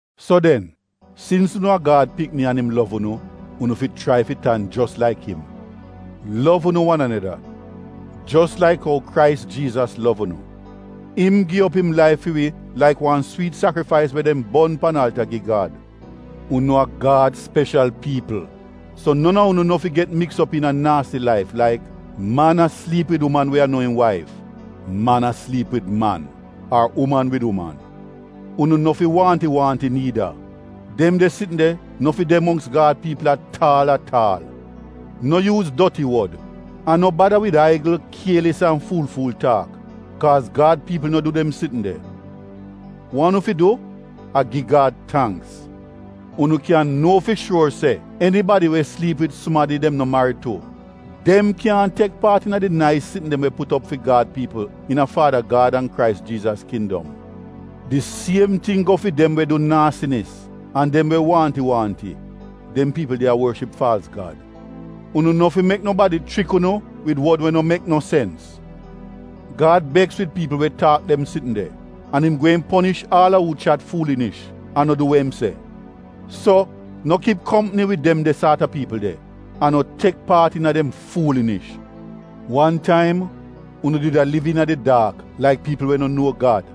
So den, sins unu a Gad pikni an im lov unu, unu fi chrai fi tan jos laik im. Lov unu wan aneda, jos laik ou Krais Jiizas lov unu. Im gi op im laif fi wi laik wan swiit sakrifais we dem bon pan alta gi Gad. Unu a Gad speshal piipl. So non a unu no fi get miks op iina naasi laif laik: man a sliip wid uman we a no im waif, man a sliip wid man, ar uman wid uman. Unu no fi waahnti-waahnti niida. Dem de sitn de no fi de mongks Gad piipl at aal at aal. No yuuz doti wod, an no bada wid aigl, kielis an fuul-fuul taak, kaaz Gad piipl no du dem sitn de. Wa unu fi du a gi Gad tangks. Unu kyan nuo fi shuor se enibadi we sliip wid sumadi dem no marid tu, dem kyaahn tek paat iina di nais sitn dem we put op fi Gad piipl iina Faada Gad an Krais Jiizas kindom. Di siem ting go fi dem we du naasinis an dem we waahnti-waahnti (dem piipl de a worship faalz gad). Unu no fi mek nobadi chrik unu wid wod we no mek no sens. Gad beks wid piipl we taak dem sitn de, an im gweehn ponish aal a uu chat fuulinish an no du we im se. So, no kip kompni wid dem de saat a piipl de, an no tek paat iina dem fuulinish. Wan taim, unu did a liv iina di daak laik piipl we no nuo Gad.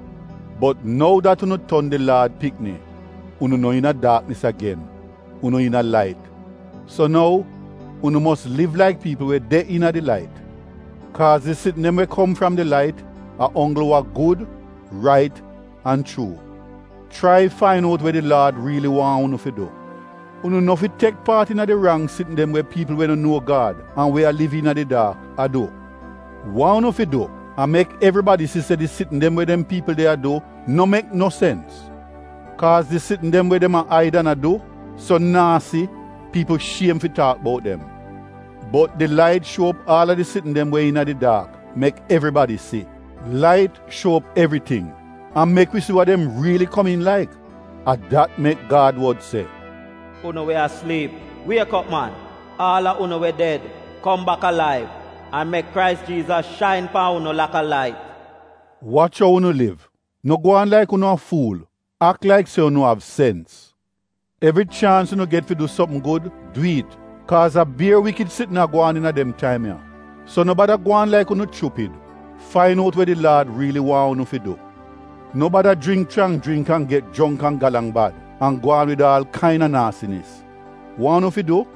Bot nou dat unu ton di Laad pikni, unu no iina daaknis agen, unu iina lait. So nou, unu mos liv laik piipl we de iina di lait, (kaaz di sitn dem we kom fram di lait, a onggl wa gud, rait an chuu). Chrai fain out we di Laad riili waahn unu fi du. Unu no fi tek paat iina di rang sitn dem we piipl we no nuo Gad an we a liv iina di daak a du. Wa unu fi du a mek evribadi si se di sitn dem we dem piipl de a du no mek no sens. Kaaz di sitn dem we dem a aid an a du, so naasi, piipl shiem fi taak bout dem. Bot di lait shuo op aal a di sitn dem we iina di daak mek evribadi si. Lait shuo op evriting an mek wi si wa dem riili komiin laik. A dat mek Gad wod se, “Unu we a sliip, wiek op, man. Aal a unu we ded, kom bak alaiv, an mek Krais Jiizas shain pan unu laka lait.” Wach ou unu liv. No gwaan laik unu a fuul. Ak laik se unu av sens. Evri chaans unu get fi du sopm gud, du it, kaaz a bier wikid sitn a gwaan iina dem taim ya. So no bada gwaan laik unu chupid. Fain out we di Laad riili waahn unu fi du. No bada jringk chrang jringk an get jongk an galang bad an gwaan wid aal kaina naasinis. Wa unu fi du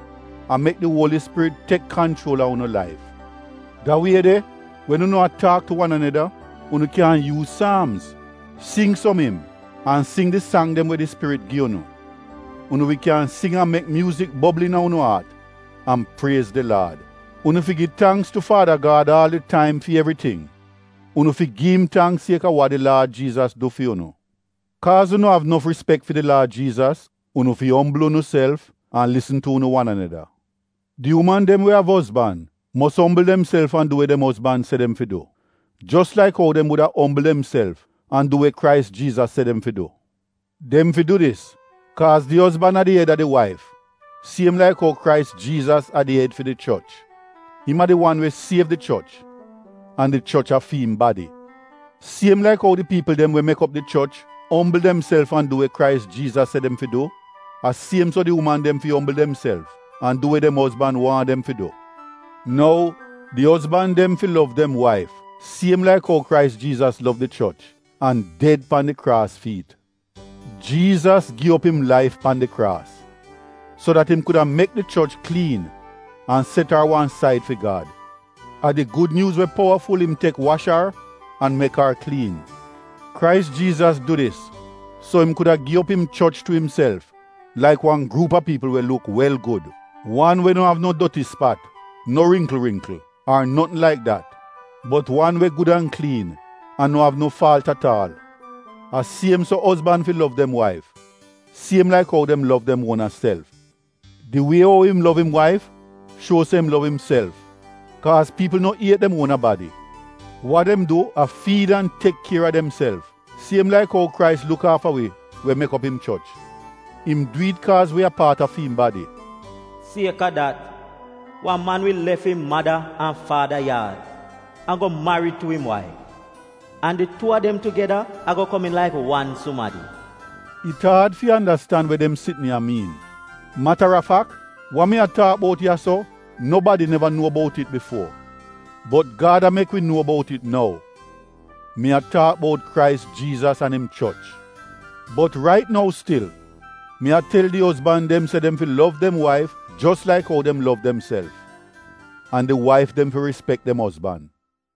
a mek di Uoli Spirit tek kanchuol a unu laif. Da wie de, wen unu a taak tu wan aneda, unu kyan yuuz saamz, sing som im, an sing di sang dem we di Spirit gi unu. Unu wi kyan sing an mek myuuzik bobl iina unu aat an priez di Laad. Unu fi gi tangks tu Faada Gad aal di taim fi evriting. Unu fi gi im tangks sieka wa di Laad Jiizas du fi unu. Kaaz unu av nof rispek fi di Laad Jiizas, unu fi ombl unuself an lisn tu unu wan aneda. Di uman dem we av ozban mos ombl demself an du we dem ozban se dem fi du jos laik ou dem wuda ombl demself an du we Krais Jiizas se dem fi du. Dem fi du dis kaaz di ozban a di ed a di waif siem laik ou Krais Jiizas a di ed fi di choch. Im a di wan we siev di choch, an di choch a fi im badi. Siem laik ou di piipl dem we mek op di choch ombl demself an du we Krais Jiizas se dem fi du, a siem so di uman dem fi ombl demself an du we dem ozban waahn dem fi du. Nou, di ozban dem fi lov dem waif siem laik ou Krais Jiizas lov di choch an ded pan di kraas fi it. Jiizas gi op im laif pan di kraas, so dat im kuda mek di choch kliin an set ar wan said fi Gad. A di Gud Nyuuz we powaful dat im tek wash ar an mek ar kliin. Krais Jiizas du dis so im kuda gi op im choch tu imself laik wan gruup a piipl we luk wel gud — wan we no av no doti spat, no ringkl ringkl, ar notn laik dat, bot wan we gud an kliin an no av no faalt at aal. A siem so ozban fi lov dem waif, siem laik ou dem lov dem uona self. Di wie ou im lov im waif shuo se im lov imself. Kaaz piipl no iet dem uona badi. Wa dem du a fiid an tek kier a demself, siem laik ou Krais luk aafa wi we mek op im choch. Im du it, kaaz wi a paat a fi im badi. “Sieka dat wan man wi lef im mada an faada yaad an go marid tu im waif, an di tuu a dem tugeda ago komiin laik wan sumadi.” It aad fi andastan we dem sitn ya miin. Mata a fak, wa mi a taak buot ya-so nobadi neva nuo bout it bifuo. Bot Gad a mek wi nuo bout it nou. Mi a taak bout Krais Jiizas an im choch. Bot rait nou stil, mi a tel di ozban dem se dem fi lov dem waif jos laik ou dem lov demself. An di waif dem fi rispek dem ozban.